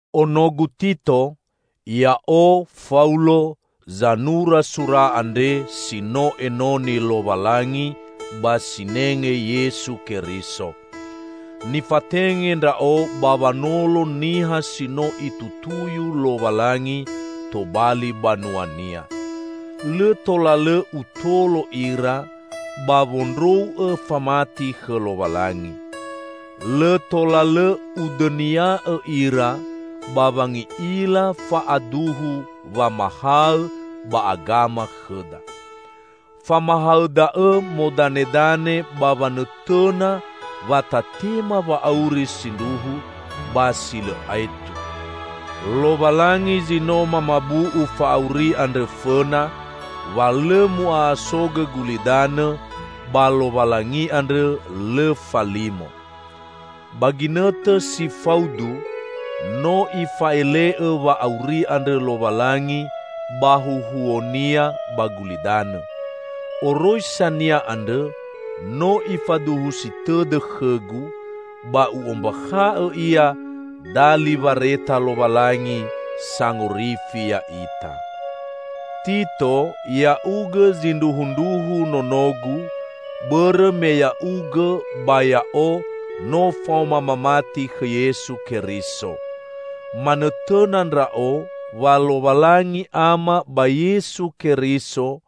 Onogu Tito! Ya'o, Faulo, zanura sura andre si no enoni Lowalangi ba sinenge Yesu Keriso. Nifatenge ndra'o ba wanolo niha si no Itutuyu Lowalangi tobali banua-Nia. Lõ tola lõ utolo ira ba wondrou'õ famati khõ Lowalangi. Lõ tola lõ udõnia'õ ira ba wangi'ila fa'aduhu wamahaõ ba agama khõda. Famahaõ da'õ modanedane ba wanõtõna wa tatema wa'auri sindruhu ba si lõ aetu. Lowalangi zi no mamabu'u fa'auri andrõ fõna wa lõ mu'a'asogõ gulidanõ -- ba Lowalangi andrõ lõ falimo. Ba ginõtõ si faudu, no Ifa'ele'õ wa'auri andrõ Lowalangi ba huhuo-Nia ba gulidanõ. Oroisa-Nia andrõ no Ifaduhusi tõdõ khõgu, ba u'ombakha'õ ia dali wareta Lowalangi Sangorifi ya'ita. Tito, ya'ugõ zindruhundruhu nonogu, bõrõ me ya'ugõ ba ya'o no faoma mamati khõ Yesu Keriso. Manõtõna ndra'o wa Lowalangi Ama ba Yesu Keriso,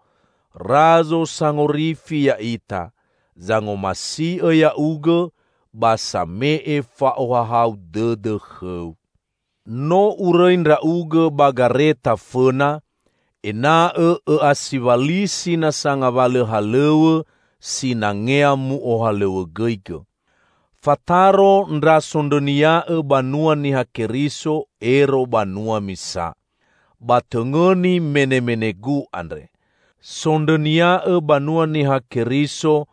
Razo Sangorifi ya'ita, zangomasi'õ ya'ugõ ba same'e fa'ohahau dõdõ khõu. No urõi ndra'ugõ ba Gareta fõna, ena'õ õ'asiwalisi nasa ngawalõ halõw̃õ sinangea mu'ohalõw̃õgõigõ. Fataro ndra sondrõnia'õ banua Niha Keriso ero banua misa. Ba tõngõni menemenegu andre: Sondrõnia'õ banua Niha Keriso,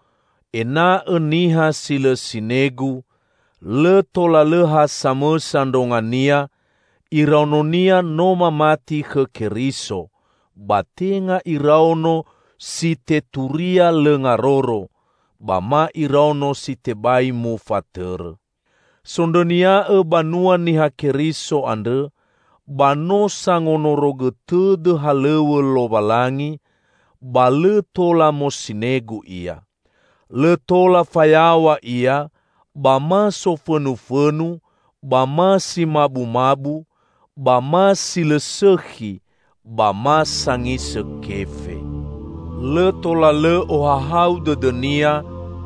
ena'õ niha si lõ sinegu; lõ tola lõ ha samõsa ndrongonia; iraononia no mamati khõ Keriso, ba tenga iraono si teturia lõ ngaroro, ba ma iraono si tebai mufatõrõ. Sondrõnia'õ banua Niha Keriso andrõ ba no sangonorogõ tõdõ halõw̃õ Lowalangi, ba lõ tola mosinegu ia. Lõ tola fayaw̃a ia ba ma sofõnufõnu ba ma si mabumabu, ba ma si lõ sõkhi, ba ma sangisõ kefe. Lõ tola lõ ohahau dõdõnia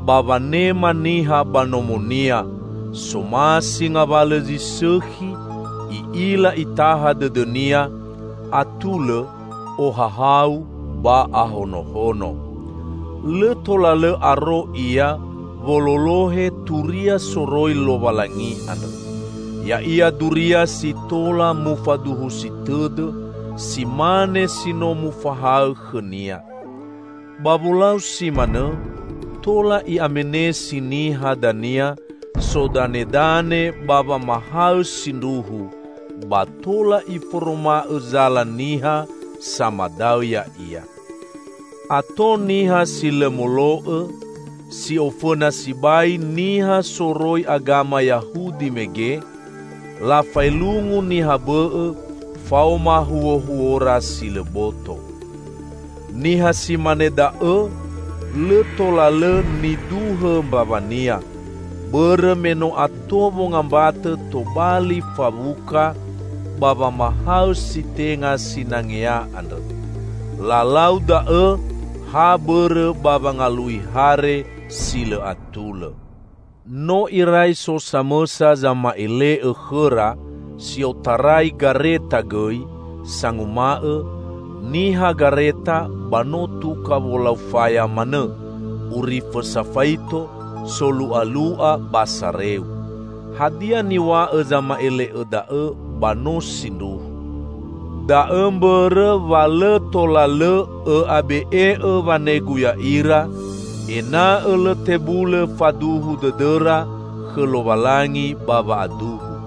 ba wanema niha ba nomonia, somasi ngawalõ zi sõkhi, i'ila itaha dõdõnia, atulõ, ohahau ba ahonohono. Lõ tola lõ aro ia wololohe turia soroi Lowalangi andrõ. Ya'ia duria si tola mufaduhusi tõdõ, si mane si no mufahaõ khõnia. Ba wolau si manõ tola i'amenesi niha dania sodanedane ba wamahaõ sindruhu, ba tola iforoma'õ zala niha samadaõ ya'ia. Ato niha si lõ molo'õ, si ofõna sibai niha soroi agama Yahudi mege; lafaelungu niha bõ'õ faoma huohuora si lõ boto. Niha si mane da'õ lõ tola lõ niduhõ mbawania, bõrõ me no ato wongambatõ tobali fawuka ba wamahaõ si tenga sinangea andrõ. Lalau da'õ ha bõrõ ba wangalui hare si lõ atulõ! No irai so samõsa zama'ele'õ khõra, si otarai Gareta gõi, sanguma'õ, "Niha Gareta ba no tuka wolau faya manõ, urifõ safaito, solu'alu'a ba sareu." Hadia niw̃a'õ zama'ele'õ da'õ ba no sindruhu. Da'õ mbõrõ wa lõ tola lõ õ'abe'e'õ wanegu ya'ira; ena'õ lõ tebulõ faduhu dõdõra khõ Lowalangi ba wa'aduhu.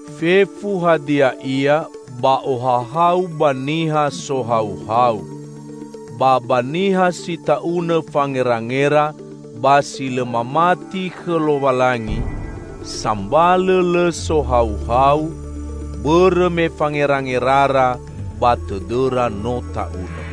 Fefu hadia ia ba ohahau ba niha sohauhau. Ba ba niha si ta'unõ fangerangera ba si lõ mamati khõ Lowalangi, sambalõ lõ sohauhau, bõrõ me fangerangerara ba tõdõra no ta'unõ!